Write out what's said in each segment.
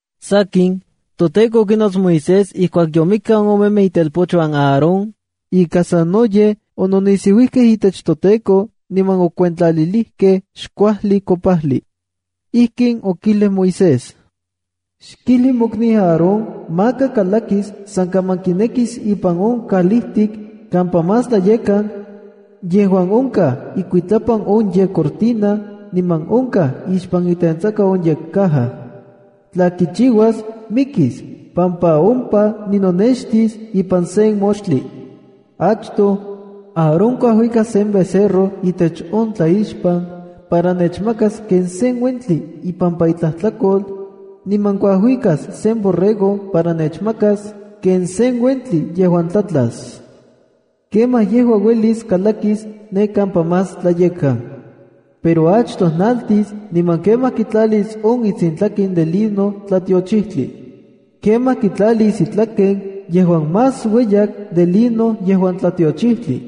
Sakin, ToTEKO okinots Moisés ijkuak yomikaj on omemej itelpochuan Aarón ika sanoyej okinisiuijkej itech toTEKO niman okiuentlalijkej xkuajli kopajli. Ijkin okijlij Moisés: “Xkijli mokniu Aarón maka kalakis san kaman kinekis ipan on kalijtik kampa Más Tlayekkan, yejuan onkaj ikuitlapan on yekcortina niman onkaj ixpan itentsaka on yekcaja. Tla kichiuas, mikis pampa ompa ninonextis ipan sen moxtli. Achtoj, Aarón kuajuikas sen becerro itech on tlaixpan para nechmakas ken sen uentli ipampa itlajtlakol, niman kuajuikas sen borrego para nechmakas ken sen uentli yejuan tlatlas. Kemaj yejua uelis kalakis ne kampa Más Tlayekkan. Pero achtoj naltis, niman kemaj kitlalis on itsintlaken de lino tlatiochijtli. Kemaj kitlalis itlaken yejuan más ueyak de lino yejuan tlatiochijtli.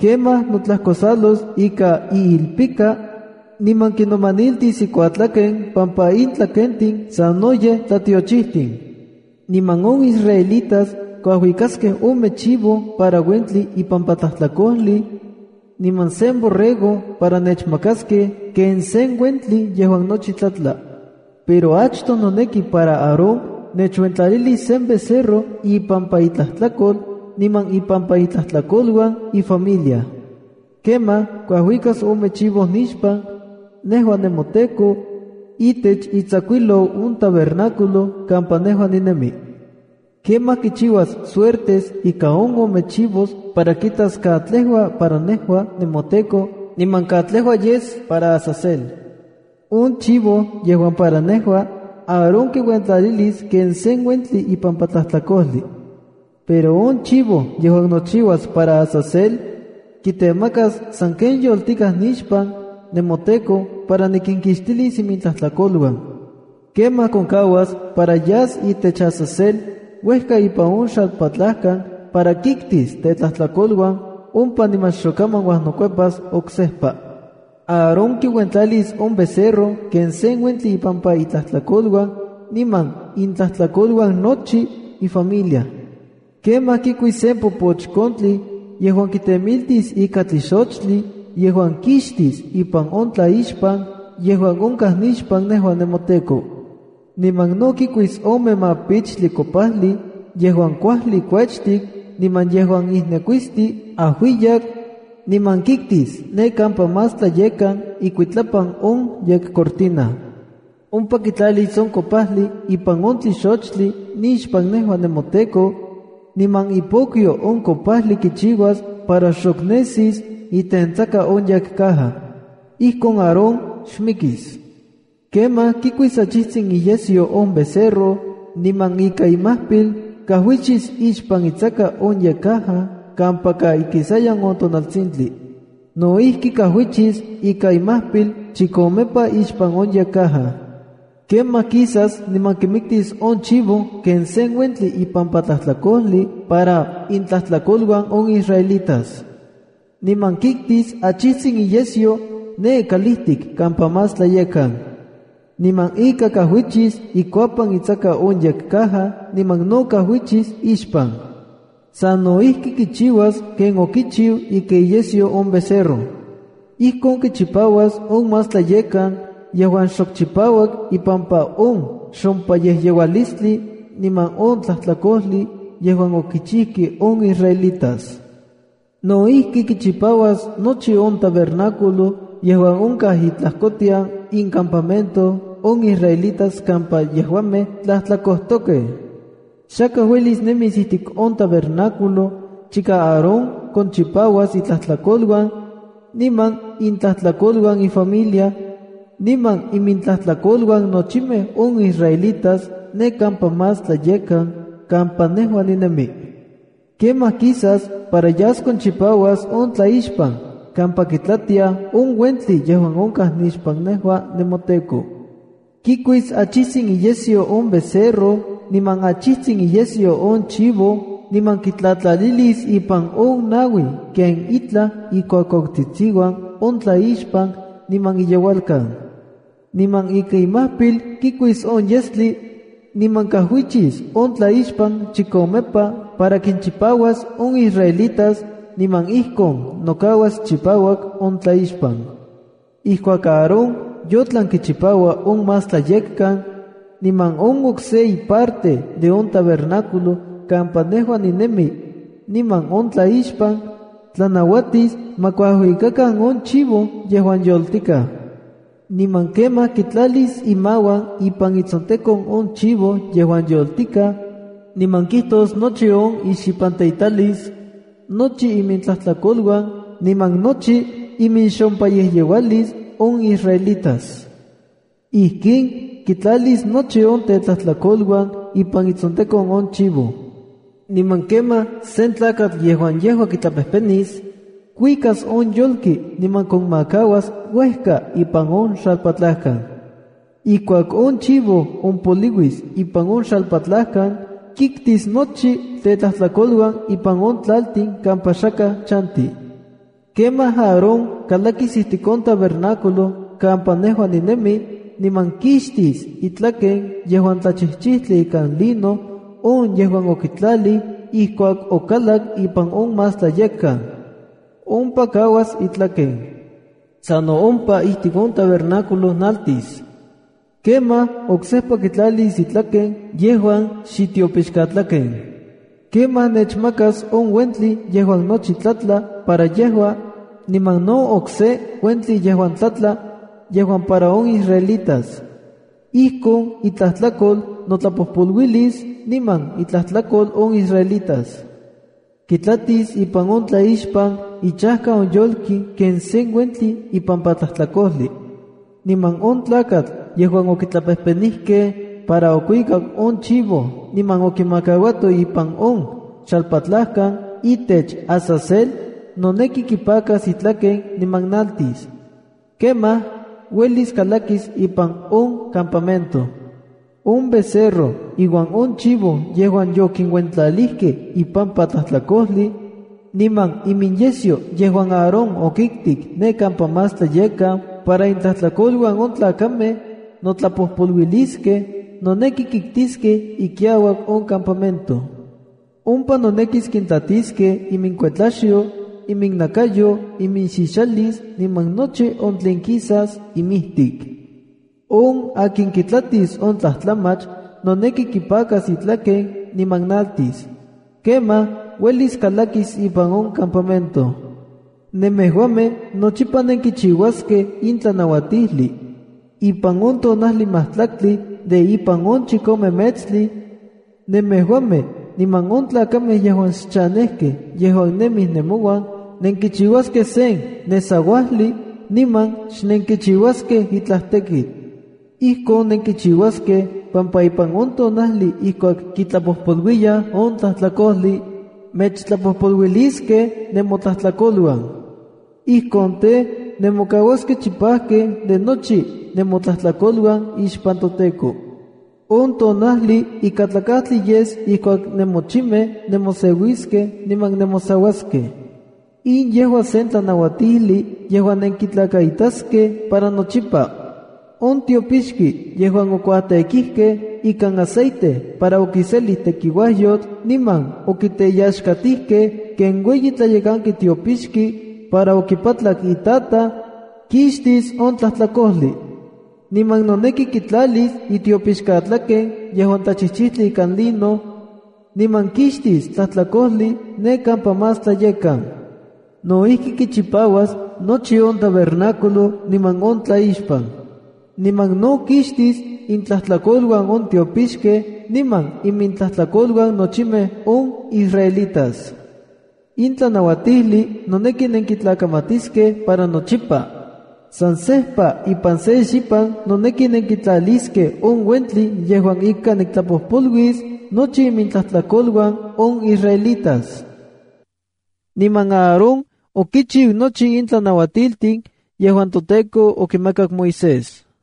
Kemaj notlajkosalos ika iilpika, niman kinomaniltis ikuatlaken pampa in tlakentin sanoyej tlatiochijtin. ’Niman on israelitas kuajuikaskej ome chivo para uentli ipampa tlajtlakojli, niman sen borrego para nechmakaskej ken sen uentli yejuan nochi tlatla. Pero achtoj noneki para Aarón nechuentlalilis sen becerro ipampa itlajtlakol niman ipampa intlajtlakoluan ifamilia. Kemaj kuajuikas ome chivo nixpan, nejua nemoTEKO, itech itsakuijlou on tabernáculo kampa nejua ninemi. Kemaj kichiuas suertes ika on ome chivo para kitas katlejua para nejua, nemoTEKO, niman katlejua yes para Azazela. On chivo yejuan para nejua, Aarón kiuentlalis ken sen uentli ipampa tlajtlakojli. Pero on chivo yejuan nochiuas para Azazel, kitemakas sanken yoltikaj nixpan, nemoTEKO, para nikinkixtilis imintlajtlakoluan. Kemaj konmakauas para yas itech Azazel uejka ipan on xalpatlajkan para kiktis tetlajtlakoluan ompa niman xokaman uajnokuepas oksejpa. ’Aarón kiuentlalis on becerro ken sen uentli ipampa itlajtlakoluan niman intlajtlakoluan nochi ifamilia. Kemaj kikuis sen popochkontli yejuan kitemiltis ika tlixochtli yejuan kixtis ipan on tlaixpan yejuan onkaj nixpan nejua nemoTEKO. Niman no kikuis ome mapichtli kopajli yejuan kuajli kuechtik niman yejuan ijnekuisti ajuiyak, niman kiktis ne kampa Más Tlayekkan ikuitlapan on yekcortina. Ompa kitlalis on kopajli ipan on tlixochtli nixpan nejua nemoTEKO, niman ipokyo on kopajli kichiuas para xok nesis itentsaka on yekcaja. Ijkon Aarón xmikis. Kemaj kikuis achijtsin iyesyo on becerro niman ika imajpil kajuichis ixpan itsaka on yekcaja kampaka ikisayan tonaltsintli. No ijki, kajuichis ika imajpil chikomepa ixpan on yekcaja. ’Kemaj kisas niman kimiktis on chivo ken sen uentli ipampa tlajtlakojli para intlajtlakoluan on israelitas. Niman kiktis achijtsin iyesyo ne kalijtik kampa Más Tlayekkan. Niman ika kajuichis ikuapan itsaka on yekcaja niman no kajuichis ixpan. Sano ijki kichiuas ken okichiu ika iyesyo on becerro. Ijkon kichipauas on Más Tlayekkan yejuan xok chipauak ipampa on xompayejyeualistli, niman on tlajtlakojli yejuan okichijkej on israelitas. No ijki, kichipauas nochi on tabernáculo yejuan onkaj itlajkotian incampamento on israelitas kampa yejuamej tlajtlakojtokej. ’Xakaj uelis nemis ijtik on tabernáculo chika Aarón konchipauas itlajtlakoluan, niman intlajtlakoluan ifamilia, niman imintlajtlakoluan nochimej on israelitas ne kampa Más Tlayekkan kampa nejua ninemi. Kemaj kisas para yas konchipauas on tlaixpan kampa kitlatiaj on uentli yejuan onkaj nixpan nejua nemoTEKO. Kikuis achijtsin iyesyo on becerro niman achijtsin iyesyo on chivo, niman kitlatlalilis ipan on naui ken itlaj ikuakuautsitsiuan on tlaixpan niman iyeualkan. Niman ika imajpil kikuis on yestli, niman kajuichis on tlaixpan chikomepa para kinchipauas on israelitas, niman ijkon nokauas chipauak on tlaixpan. ’Ijkuak Aarón yotlan kichipaua on Más Tlayekkan, niman on okse iparte de on tabernáculo kampa nejua ninemi niman on tlaixpan, tlanauatis ma kuajuikakan on chivo yejuan yoltikaj. Niman kemaj kitlalis imauan ipan itsontekon on chivo yejuan yoltikaj, niman kijtos nochi on ixipanteitalis, nochi imintlajtlakoluan niman nochi iminxopeyejyeualis on israelitas. Ijkin kintlalis nochi on tetlajtlakoluan ipan itsontekon on chivo. Niman kemaj sen tlakatl yejuan yejua kitlapejpenis, kuikas on yolki niman konmakauas uejka ipan on xalpatlajkan. Ijkuak on chivo ompoliuis ipan on xalpatlajkan, kiktis nochi tetlajtlakoluan ipan on tlaltin kampa xakaj chanti. ’Kemaj Aarón kalakis ijtik on tabernáculo kampa nejua ninemi, niman kixtis itlaken yejuan tlachijchijtli ikan lino on yejuan okitlalij ijkuak okalak ipan on Más Tlayekkan. Ompa kauas itlaken. Sano ompa ijtik on tabernáculo, naltis. Kemaj oksejpa kitlalis itlaken yejuan xitiopixkatlaken. Kemaj nechmakas on uentli yejuan nochi tlatla para yejua, niman no okse uentli yejuan tlatla, yejuan para on israelitas. Ijkon itlajtlakol notlapojpoluilis niman intlajtlakol on israelitas. Kitlatis ipan on tlaixpan ichajka on yolki ken sen uentli ipampa tlajtlakojli. Niman on tlakatl yejuan okitlapejpenijkej para okuikak on chivo niman okimakauato ipan on xalpatlajkan itech Azazel, noneki kipakas itlaken niman naltis. Kemaj, uelis kalakis ipan on campamento. ’On becerro iuan on chivo yejuan yokinuentlalijkej ipampa tlajtlakojli, niman iminyesyo yejuan Aarón okiktik ne kampa Más Tlayekkan para intlajtlakoluan on tlakamej notlapojpoluiliskej, noneki kiktiskej ikiauak on campamento. Ompa nonekis kintlatiskej iminkuetlaxyo, iminnakayo, iminxixalis, niman nochi on tlen kisas imijtik. On akin kitlatis on tlajtlamach, noneki kipakas itlaken, niman naltis. Kemaj uelis kalakis ipan on campamento. ’Nemejuamej nochipa nenkichiuaskej in tlanauatijli: Ipan on tonajli majtlaktli de ipan on chikome metstli, nemejuamej niman on tlakamej yejuan xchanejkej yejuan nemij nemouan nenkichiuaskej sen nesauajli niman xnenkichiuaskej itlaj tekitl. Ijkon nenkichiuaskej pampa ipan on tonajli ijkuak kitlapojpoluiyaj on tlajtlakojli, mechtlapojpoluiliskej nemotlajtlakoluan. Ijkon tej, nemokauaskej chipajkej de nochi nemotlajtlakoluan ixpan toTEKO. On tonajli ikatlakajtli yes ijkuak nemochimej nemoseuiskej niman nemosauaskej. In yejua sen tlanauatijli yejuan nenkitlakaitaskej para nochipa. On tiopixki yejuan okuatêkijkej ikan aceite para okiselij tekiuajyotl niman okiteyaxkatijkej ken ueyi tlayekanki tiopixki para okipatlak itataj, kixtis on tlajtlakojli. Niman noneki kitlalis itiopixkatlaken yejuan tlachijchijtli ikan lino, niman kixtis tlajtlakojli ne kampa Más Tlayekkan. No ijki, kichipauas nochi on tabernáculo niman on tlaixpan. Niman no kixtis intlajtlakoluan on tiopixkej niman imintlajtlakoluan nochimej on israelitas. ’In tlanauatijli noneki nenkitlakamatiskej para nochipa: San sejpa ipan se xipan noneki nenkitlaliskej on uentli yejuan ika niktlapojpoluis nochi imintlajtlakoluan on israelitas.” Niman Aarón okichiu nochi in tlanauatiltin yejuan toTEKO okimakak Moisés.